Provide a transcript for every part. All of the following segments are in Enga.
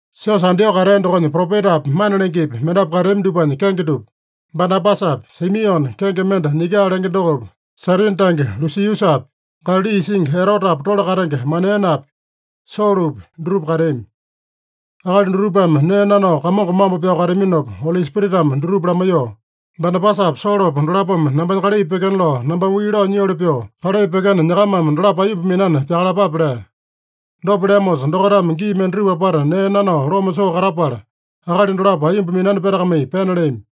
Siosa Antioko katea dokonya propetapi, mana lengepi, mendapu kateami dupanya kenge dupa: Banabasapi, Simione kenge mende Niga lenge dokopi, Sairini tange Lusiusapi, Galali isingi Erotepa tole katenge Manaenepi, Solopi, dutupa kateami. Akali dutupame nee nanao Kamongo mambo pyao kateaminopa, Oli Spiritame dutupa lamaiyoo, “Banabasapa Solopa dolapome nambanya kalai pyekena lao nambame wii lao nyioli pyoo kalai pyekena, nyakamame dolapo aiyomba minani pyakalapape” lea. Dopa leamosa, dokaitame gii mendatupa apata nee nanao loma soo katapala, akali dolapo aiyomba minani petakamai pena leami.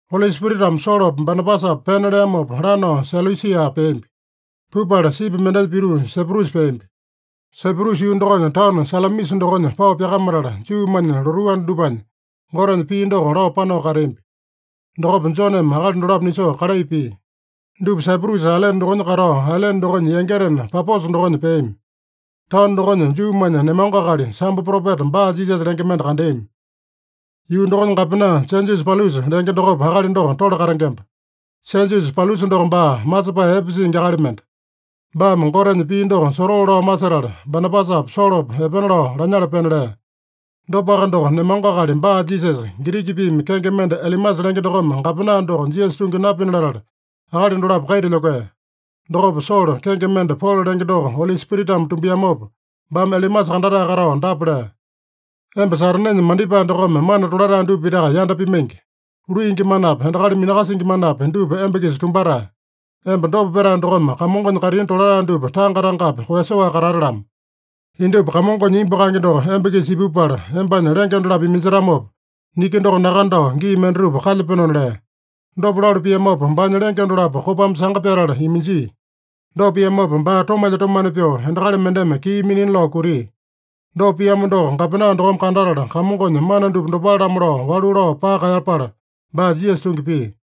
Oli Spiritame Solopa, Banabasapa pena leamopa, lanao Selusia peambi. Pupala sipi mendenya pituu Saiprusa peambi. Saiprusa yuu dokonya taono Salamisa dokonya pao pyakamatala, Juumanya lotuu anda dupanya Gotenya pii doko lao panao kateambi. Dokopa Joneme akali dolapo nisoo kalai pia. Dupa Saiprusa ailene dokonya katao, ailene dokonya yangitena Paposa dokonya peami. Taono dokonya Juumanya nemango akali, sambo propeta Bar-Jisasa lenge mende kandeami. Yuu dokonya gapena, Sejiusa Paulusa lenge dokopa akali doko tole katengemba. Sejiusa Paulusa doko baa masepae epe singi akali mende. Baame Gotenya pii doko sotoo lao masetala, Banabasapa Solopa epena lao lanyala pena lea. Dopaka doko, nemango akali Bar-Jisasa, Giriki piimi kenge mende Elimasa lenge dokome gapena doko Jisasa tungi napina latala, akali dolapo kaita lyokea. Dokopa Solo, kenge mende Polo lenge doko Oli Spiritame tumbiamopa, baame Elimasa kandatae katao dapa lea: “Emba Satanenya mandipae dokome mana tolatae dupa pitaka yanda pimaingi. Luingi manapi, endakali minakasingi manapi, dupa emba-kisa tumbatae. Emba dopa petae dokome Kamongonya kaitini tolatae dupa tanga-tangapi koeyasoaka katate-lamo! Indupa Kamongonya imbu kaenge doko emba-kisa ipupala, embanya lenge dolapo iminjetamopa, niki doko nakandao gii mendatupa kalyapenona” lea. Dopa lalu piamopa, baanya lenge dolapo kopame sanga pyatala iminjia. Dopa piamopa baa tomalya-tomane pyoo, endakali mendeme kii minina lao kutia. Dopa piamo doko gapena dokome kandatala, Kamongonya mana dupa dopale-lamo lao walu lao paka kaeyapala, baa Jisasa tungi pia.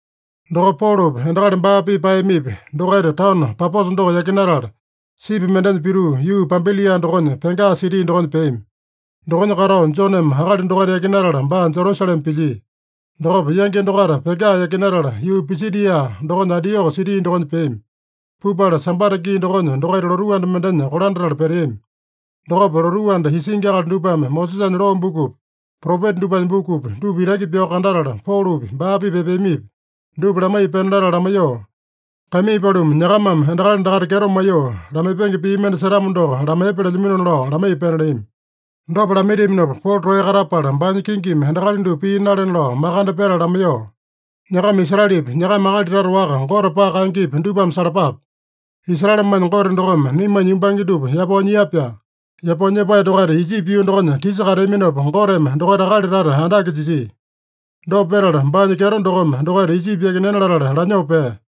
Dokopa Polopi, endakali baa-pipa paeyamipi, dokaita taono Paposa doko yakinatala, sipi mendenya pituu, yuu Pampilia dokonya Pega siti dokonya peami. Dokonya katao Joneme akali dokaita yakinatala baa Jerusalema pilyia. Dokopa yangi dokaita Pega yakinatala, yuu Pisidia dokonya Antioko siti dokonya peami. Pupala Sambata gii dokonya dokaita lotuu anda mendenya kolandatala peteami. Dokopa lotuu anda isingi akali dupame Mosesanya loo bukupi, propeta dupanya bukupi, dupa itaki pyao kandatala, Polopi, baa-pipa epeamipi, dupa lamaiya pena latala lamaiyoo, “Kaimii paluma, nyakamame endakali dakaita kyeto maiyoo lamaipenge pii mende setamo doko lamaiyepa” lelyaminona lao lamaiya pena leami. Dopa lamaitiaminopa Polo toeya katapala, baanya kingimi endakali dupa pii nalena lao makande petala lamaiyoo, “Nyakama Israelepi, nyakama akali tata waka Gote paka kaengepi, dupame salapape. Israelemanya Gote dokome naimanya yumbange dupa yapao nyia-pyaa. Yapao nyepae dokaita Ijipi yuu dokonya tisa kateaminopa, Goteme dokaita akali tata andake jisia. Dopa petala, baanya kyeto dokome dokaita Ijipi yakinena latala lanyoo pea.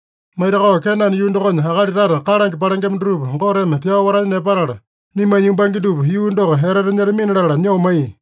Maitakao Kenane yuu dokonya akali tata kalange palengema dutupa Goteme pyao watanya nepatala, naimanya yumbange dupa yuu doko etete nyetamina latala nyoo maiya.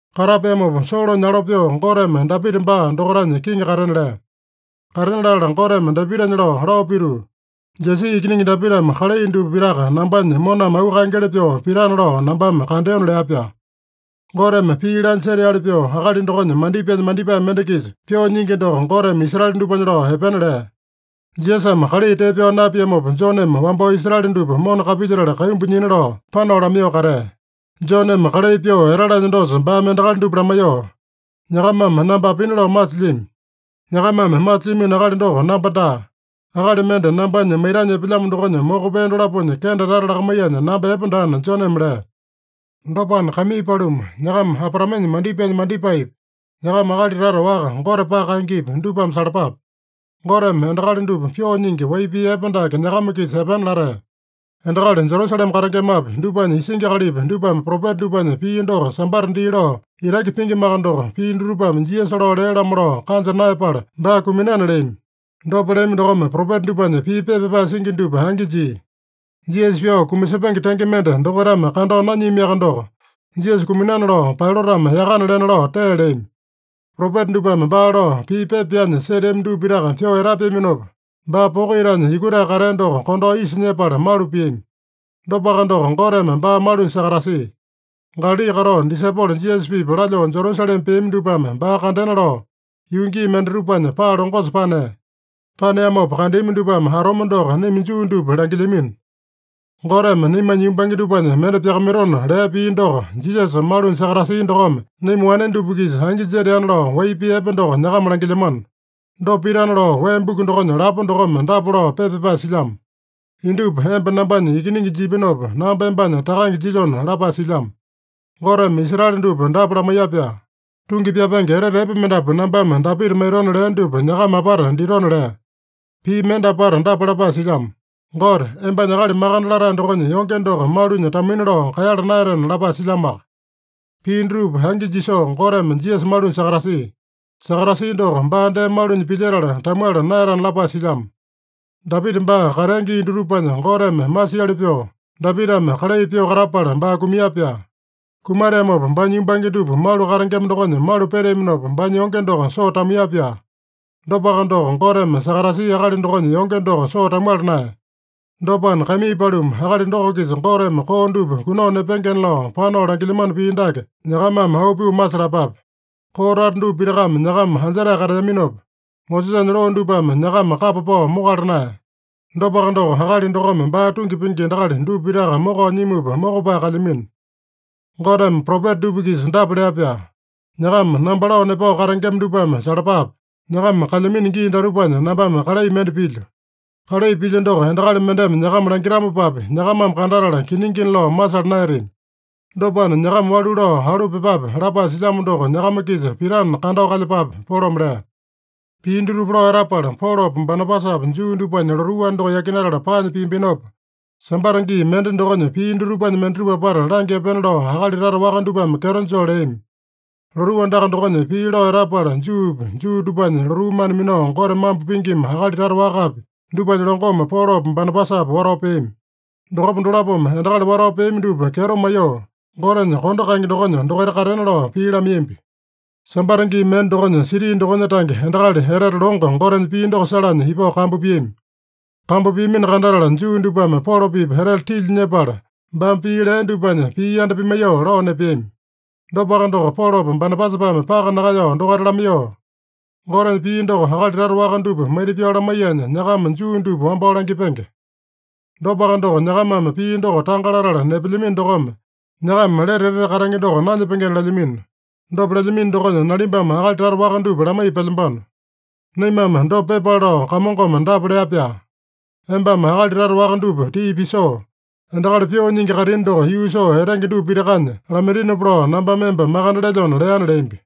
Katapeamopa, Solonya alo pyoo Goteme Dapita baa dokaitanya kiŋi katena lea. Katena latala Goteme Dapitanya lao, lao pituu, ‘Jesi ikiningi Dapitame kalai dupa pitaka nambanya moname auu kaengeli pyoo pitana lao nambame kandeona’ lea-pyaa. Goteme pii laanya seteali pyoo akali dokonya mandipaenya mandipae mende-kisa pyoo nyingi doko Goteme Israele dupanya lao epena lea. Jisasame kalai tee pyao napiamopa, Joneme wambao Israele dupa mona kapilyetala kaimbu nyina lao panao lamaiyoo katea. Joneme kalai pyoo etalanya dosa baame endakali dupa lamaiyoo, ‘Nyakamame namba apina lao masilyami? Nyakamame masilyamino akali doko namba daa. Akali mende nambanya maitanya epelyamo dokonya moko pee dolaponya kende tata lakamaiyanya namba epe daana’ Joneme lea. “Dopana, kaimii paluma, nyakama Abraamenya mandipaenya mandipaepi, nyakama akali tata waka Gote paka kaengepi, dupame salapape. Goteme endakali dupa pyoo nyingi wai pii epe dake nyakama-kisa epena latea. Endakali Jerusalema katengemapi, dupanya isingi akalipi, dupame propeta dupanya pii doko Sambata dii lao itaki pingimaka doko, pii dutupame Jisasa lao lea-lamo lao kanja naeyapala baa kuminana leami. Dopa leami dokome propeta dupanya pii pepa pyapae singi dupa angi jia. Jisasa pyao kumasepenge tenge mende dokaitame kandao nanyiamiaka doko, Jisasa kuminana lao Pailatame yakana lena lao tee leami. Propeta dupame baa lao pii pepa pyanya seteami dupa pitaka pyoo etapeaminopa, baa poko itanya yukutae katea doko kondao isa nyepala malu piami. Dopaka doko, Goteme baa malunya sakatasia. Galali katao disaipolo Jisasa-pipa lalyoo Jerusalema peami dupame baa kandena lao yuu gii mendatupanya paa longosa panea. Paneamopa kandeami dupame atome doko naima Juu dupa langilyamino. Goteme naimanya yumbange dupanya mende pyakamaitona lea pii doko, Jisasa malunya sakatasia dokome, naima wane dupa-kisa angi jeteana lao, wai pii epe doko nyakama langilyamano. Dopa pitana lao wee buku dokonya lapo dokome dapa lao pepa pyapae silyamo: ‘Indupa emba nambanya Ikiningi jipinopa, namba embanya Takange jilyona’ lapae silyamo. Goteme Israele dupa dapa lamaiya-pyaa: ‘Tungi pyapenge etete epe mendapu nambame Dapita maitona leo dupa nyakama apata ditona’ lea. Pii mende apata dapa lapae silyamo: ‘Gote, embanya Akali Makande Latae dokonya yonge doko malunya tamuina lao kaeyala naeyatena’ lapae silyamoaka. Pii dutupa angi jisoo Goteme Jisasa malunya sakatasia. Sakatasia doko, baa dee malunya pilyetala tamuala naeyatana lapae silyamo. Dapita baa katea gii dutupanya, Goteme masiali pyoo Dapitame kalai pyoo katapala baa kumia-pyaa. Kumateamopa baanya yumbange dupa malu katengema dokonya malu peteaminopa, baanya yonge doko soo tamuiya-pyaa. Dopaka doko, Goteme sakatasia akali dokonya yonge doko soo tamuala naeya. Dopana, kaimii paluma, akali doko-kisa Goteme koo dupa kunao nepengena lao panao langilyamano pii dake nyakamame auu pyoo masalapape. Koo tata dupa pitakame nyakama anjetae kateaminopa, Mosesanya loo dupame nyakama kapa pao mokala naeya. Dopaka doko, akali dokome baa tungi pingi endakali dupa pitaka mokao nyimupa mokopae kalyamino. Goteme propeta dupa-kisa dapa lea-pyaa: ‘ “Nyakama namba lao nepao katengema dupame salapape: Nyakama kalyamino gii datupanya nambame kalai mende pilyo. Kalai pilyo doko endakali mendeme nyakama langitamopapi, nyakamame kandatala kiningina lao masala naeyatami. Dopana, nyakama walu lao alu pyepape” lapae silyamo doko nyakama-kisa pitana, kandao kalyepape’” Polome lea. Pii dutupa lao etapala, Polopa Banabasapa Juu dupanya lotuu anda doko yakinatala paanya piambinopa, Sambata gii mende dokonya pii dutupanya mendatupa apata langya epena lao akali tata waka dupame kyeto joo leami. Lotuu andaka dokonya pii lao etapala, Juupi, Juu dupanya lotuu mana minao Gote mambo pingima akali tata wakapi, dupanya longome Polopa Banabasapa watao peami. Dokopa dolapome endakali watao peami dupa kyeto maiyoo, Gotenya kondo kaenge dokonya dokaita katena lao pii lamaiyambi. Sambata gii mende dokonya, siti dokonya tange endakali etete longo Gotenya pii doko salanya ipao kambu piami. Kambu piamino kandatala, Juu dupame Polo-pipa etete tilya nyepala, baame pii lea dupanya pii yanda pimaiyoo lao nepeami. Dopaka doko, Polopa Banabasapame paka nakaeyao dokaita lamaiyoo, “Gotenya pii doko akali tata waka dupa maita-pyao lamaiyanya, nyakama Juu dupa wambao langipenge. Dopaka doko, nyakamame pii doko tanga latala nepelyamino dokome, nyakama lete etete katenge doko nanyepengena lelyamino. Dopa lelyamino dokonya, nalimbame akali tata waka dupa lamaiya pelyambano. Naimame dopa pyepale lao Kamongome dapa lea-pyaa: ‘Embame akali tata waka dupa tii pisoo, endakali pyoo nyingi kaitini doko yuu soo etenge dupa pitakanya lamaitinopa lao nambame emba makande lelyona’ leana” leambi.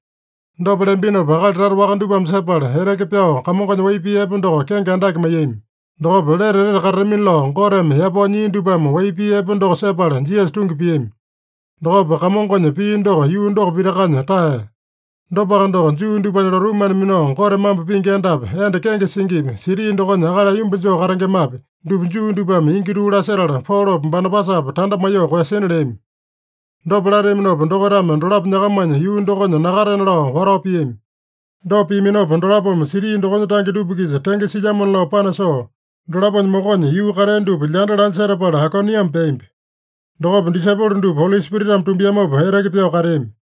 Dopa leambinopa akali tata waka dupame sepala, eteke pyao Kamongonya wai pii epe doko kenge andake maiyami. Dokopa lete etete katatamina lao Goteme yapao nyia dupame wai pii epe doko sepala Jisasa tungi piami. Dokopa Kamongonya pii doko yuu doko pitakanya taeya. Dopaka doko, Juu dupanya lotuu mana minao Gote mambo pingi endapi, enda kenge singipi, siti dokonya akali aiyomba joo katengemapi, dupa Juu dupame ingi tuu lasetala, Polopa Banabasapa tanda maiyoo koeyasina leami. Dopa lateaminopa, dokaitame dolapo nyakamanya yuu dokonya nakatena lao watao piami. Dopa piaminopa, dolapome siti dokonya tange dupa-kisa tenge silyamona lao panasoo, dolaponya mokonya yuu katea dupa lyanda lanya setapala, Aikoniame peambi. Dokopa disaipolo dupa Oli Spiritame tumbiamopa eteke pyao kateami.